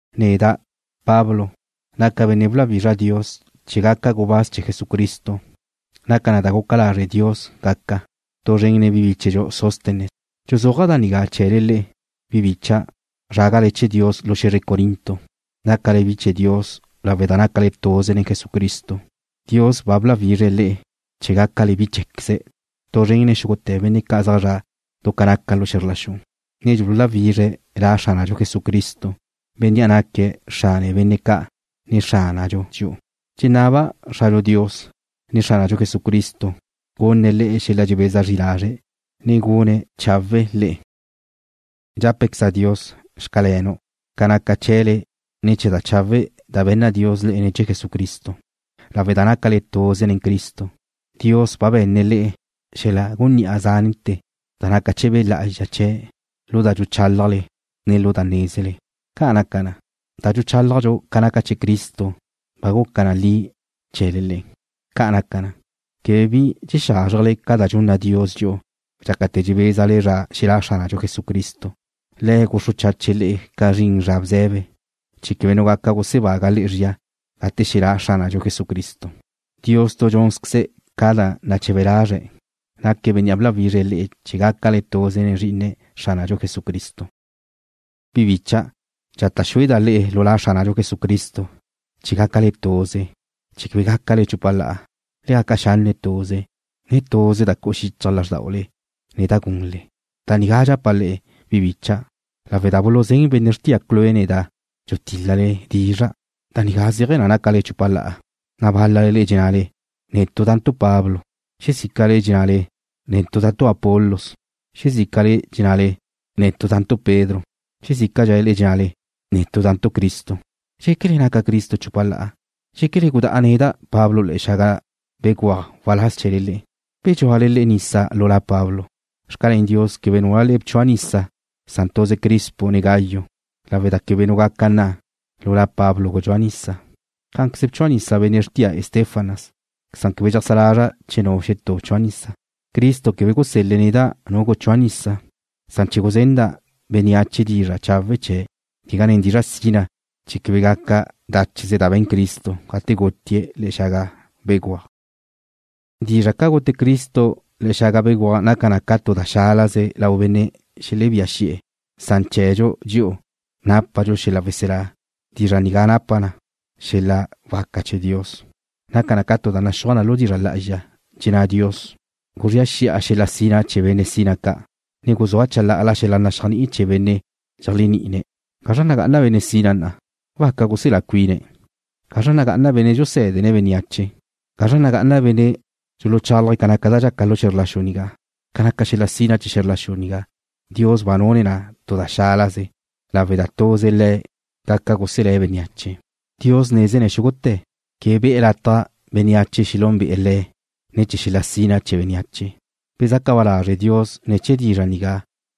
Neda', Pablo, naca' benne' bláwizra Dios chee̱ gaca' gubáz chee̱ Jesucristo. Naca na da guca lazre' Dios gaca'. Tu zren nen bíchedxu Sóstenes dxuzúaja' da nigá chee̱le le'e, bi bicha', zrágale chee̱ Dios lu xe̱zre Corinto. Nácale bi chee̱ Dios lawe' da nácale tuze nen Jesucristo. Dios ba bláwizre̱' le'e chee̱ gácale bi chee̱queze̱' tu zren nen xúgute̱ benne' ca' zaj zre̱'e̱ du ca naca xe̱zr la xu, ne dxululáwizre̱' La Xránadxu Jesucristo, Bénnea' naque̱' Xrane benne' ca', ne Xránadxu dxi'u. Dxenaba' Xradxu Dios, ne Xránadxu Jesucristo gunne̱' le'e xel-la dxebeza zri lazre', ne gun chawe̱'e̱ le'e. Dxápequeza' Dios: Xcalenu', ca naca chee̱le ne̱ chee̱ da chawe' da be̱nna Dios le'e ne̱ chee̱ Jesucristo. Lawe' da nácale tuze nen Cristo, Dios ba be̱nne̱' le'e xel-la gunní'a zante̱ da naca chee̱ Be' Lá'azxa chee̱', lu da dxuchálajle, ne lu da nézele. Ca' naca na, da dxuchálajdxu ca naca chee̱ Cristo ba guca na li chee̱le le'e. Ca' naca na, quebe bi dxexázrjele ca da dxunna Dios dxi'u dxácate̱ dxebézadxu zra xelá' Xránadxu Jesucristo. Le̱' guxru chache̱' le'e ca zrin zra bze̱be, chee̱ quebe nu benne' gaca gusebágue̱' le'e zría gate xelá' Xránadxu Jesucristo. Dios tu dxúnzqueze̱' ca da nache̱be lazre̱', naque̱' Bénnea' bláwizre̱' le'e chee̱ gácale tuze nen Zrí'ine̱', Xránadxu Jesucristo. Bi bicha', dxata' xúeda' le'e lu La Xránadxu Jesucristo, chee̱ gácale tuze, ne quebe gácale chupa la'a. Le gaca xanne' tuze, ne tuze da cu'u xichaj lázrdaule, ne da gunle. Da nigá dxapa' le'e, bi bicha', lawe' da buluzén benne' xrtia Cloé neda' dxutíl-lale dizra'. Da nigá zéaje̱ na nácale chupa la'a, na' bál-lale dxennale: Netu' da'ntu' Pablo. Xezícale' dxennale: Netu' da'ntu' Apolos. Xezícale dxennale: Netu' da'ntu' Pedro. Xezícale dxennale: Netu' da'ntu' Cristo. ¿Dxéquele naca Cristo chupa la'a? ¿Dxéquele gudá'a neda', Pablo, le̱'e̱ xaga béguaj waláz chee̱le? ¿Bedxúale le'e nisa lu la Pablo? Xcalén Dios quebe núlale le'e bchua' nisa san tuze Crispo, ne Gayo lawe' da quebe nu gaca nna: Lu la Pablo gudxúa' nisa. Cá'anqueze bchua' nisa benne' xrtia Estéfanas, san quebe dxeajsá lazra' che nu xetú bchua' nisa. Cristo quebe gusel-le̱' neda' nu guchúa' nisa, san chee̱ guzenda' bénneache dizra' chawe' chee̱', quegá nen dizra' sina, chee̱ quebe gaca dácheze da be̱n Cristo gate gutie̱' le̱'e̱ xaga béguaj. Dizra' ca gute Cristo le̱'e̱ xaga béguaj naca na ca tu da xálaze lau benne' xelebía xi'e̱, san chee̱dxu dxi'u, nápadxu xel-la weselá, dizra' nigá napa na xel-la waca chee̱ Dios. Naca na ca naxúaj na lu dizra' lá'azxa. Dxenná Dios: Guzría xi'a xel-la sina chee̱ benne' sina ca', ne guzúa' chalá'ala xel-la naxéajni'i chee̱ benne' dxeléajni'ine̱'. ¿Gazra nagá'ana benne' sina na'a? ¿Waca guselá cuine̱'? ¿Gazra nagá'ana benne' dxusé̱dene̱' bénneache? ¿Gazra nagá'ana benne' dxuchálaje̱' ca naca da dxaca lu xe̱zr la xu nigá? Ca naca xel-la sina chee̱ xe̱zr la xu nigá, Dios ba nune̱' na tu da xálaze lawe' da tuze Le̱' gaca guselé̱' bénneache. Dios nézene̱' xúgute̱. Quebe be̱'e̱ lataj bénneache xelúnbe'e̱ Le̱' ne̱ chee̱ xel-la sina chee̱ bénneache. Bezaca ba lazre̱' Dios ne̱ chee̱ dizra' nigá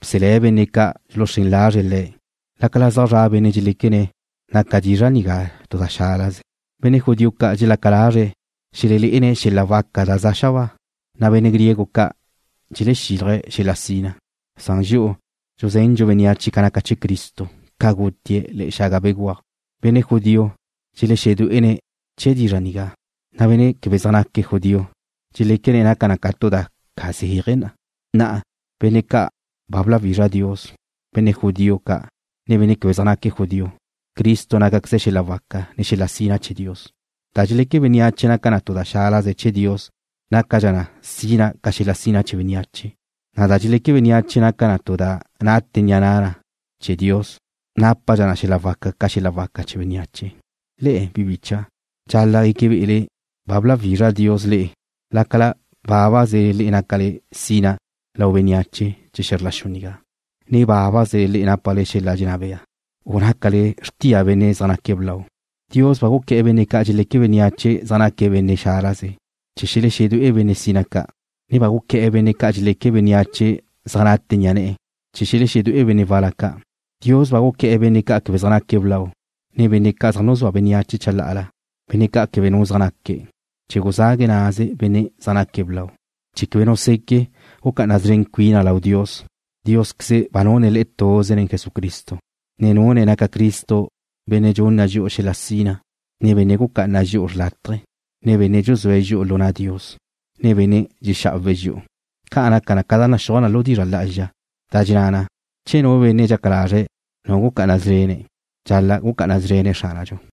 bselé̱' benne' ca' dxuluxrén lazre̱' Le̱', lácala zaj zra' benne' dxeléquene̱' naca dizra' nigá tu da xálaze. Benne' judío ca' dxelaca lazre̱' xelelé'ene̱' xel-la waca da za xabáa, na' benne' griego ca' dxelexílaje̱' xel-la sina, san dxi'u dxuzendxu bénneache ca naca chee̱ Cristo, ca gutie̱' le̱'e̱ xaga béguaj. Benne' judío dxelexedué'ene̱' chee̱ dizra' nigá, na' benne' quebe zaj naque̱' judío dxeléquene̱' naca na tu da ca zeaje na. Na'a, benne' ca' ba bláwizra Dios, benne' judío ca', ne benne' quebe zaj naque̱' judío, Cristo nácaqueze̱' xel-la waca, ne xel-la sina chee̱ Dios. Da dxeleque bénneache naca tu da xálaze chee̱ Dios nácadxa na sina ca xel-la sina chee̱ bénneache, na' da dxeleque bénneache naca na tu da naca bea nate ni'a na' Dios nápadxa na xel-la waca ca xel-la waca chee̱ bénneache. Le'e, bi bicha', dxal-la' gueque be'ele ba bláwizra Dios le'e lácala bábaze le'e nácale sina lau bénneache chee̱ xe̱zr la xu nigá, ne bábaze le'e nápale xel-la dxenná bea, u nácale xrtia benne' zaj naque̱' blau. Dios ba guqué̱'e̱ benne' ca' dxeleque bénneache zaj naque̱' benne' xálaze, chee̱ xelexedué'e benne' sina ca', ne ba guqué̱'e̱ benne' ca' dxeleque bénneache zaj nate ni'a ne̱'e̱, chee̱ xelexedué'e benne' wal-la ca'. Dios ba guqué̱'e̱ benne' ca' quebe zaj naque̱' blau, ne benne' ca' zaj nuzúa bénneache chalá'ala, benne' ca' quebe nu zaj naque̱', chee̱ guzague̱' naze benne' zaj naque̱' blau, chee̱ quebe nu seque' gucá'ana szren cuina lau Dios. Diósqueze ba nune̱' le'e tuze nen Jesucristo, ne nune̱' naca Cristo Benne' dxunna dxi'u xel-la sina, ne Benne' gucá'ana dxi'u xrlátaje, ne Benne' dxuzúe̱' dxi'u lu na' Dios, ne benne' dxexá'awe̱' dxi'u. Ca' naca na ca da naxúaj na lu dizra' lá'azxa, da dxenná na: Che nu benne' dxaca lazre̱' nu gucá'ana szrene̱', dxal-la' gucá'ana szrene̱' Xránadxu.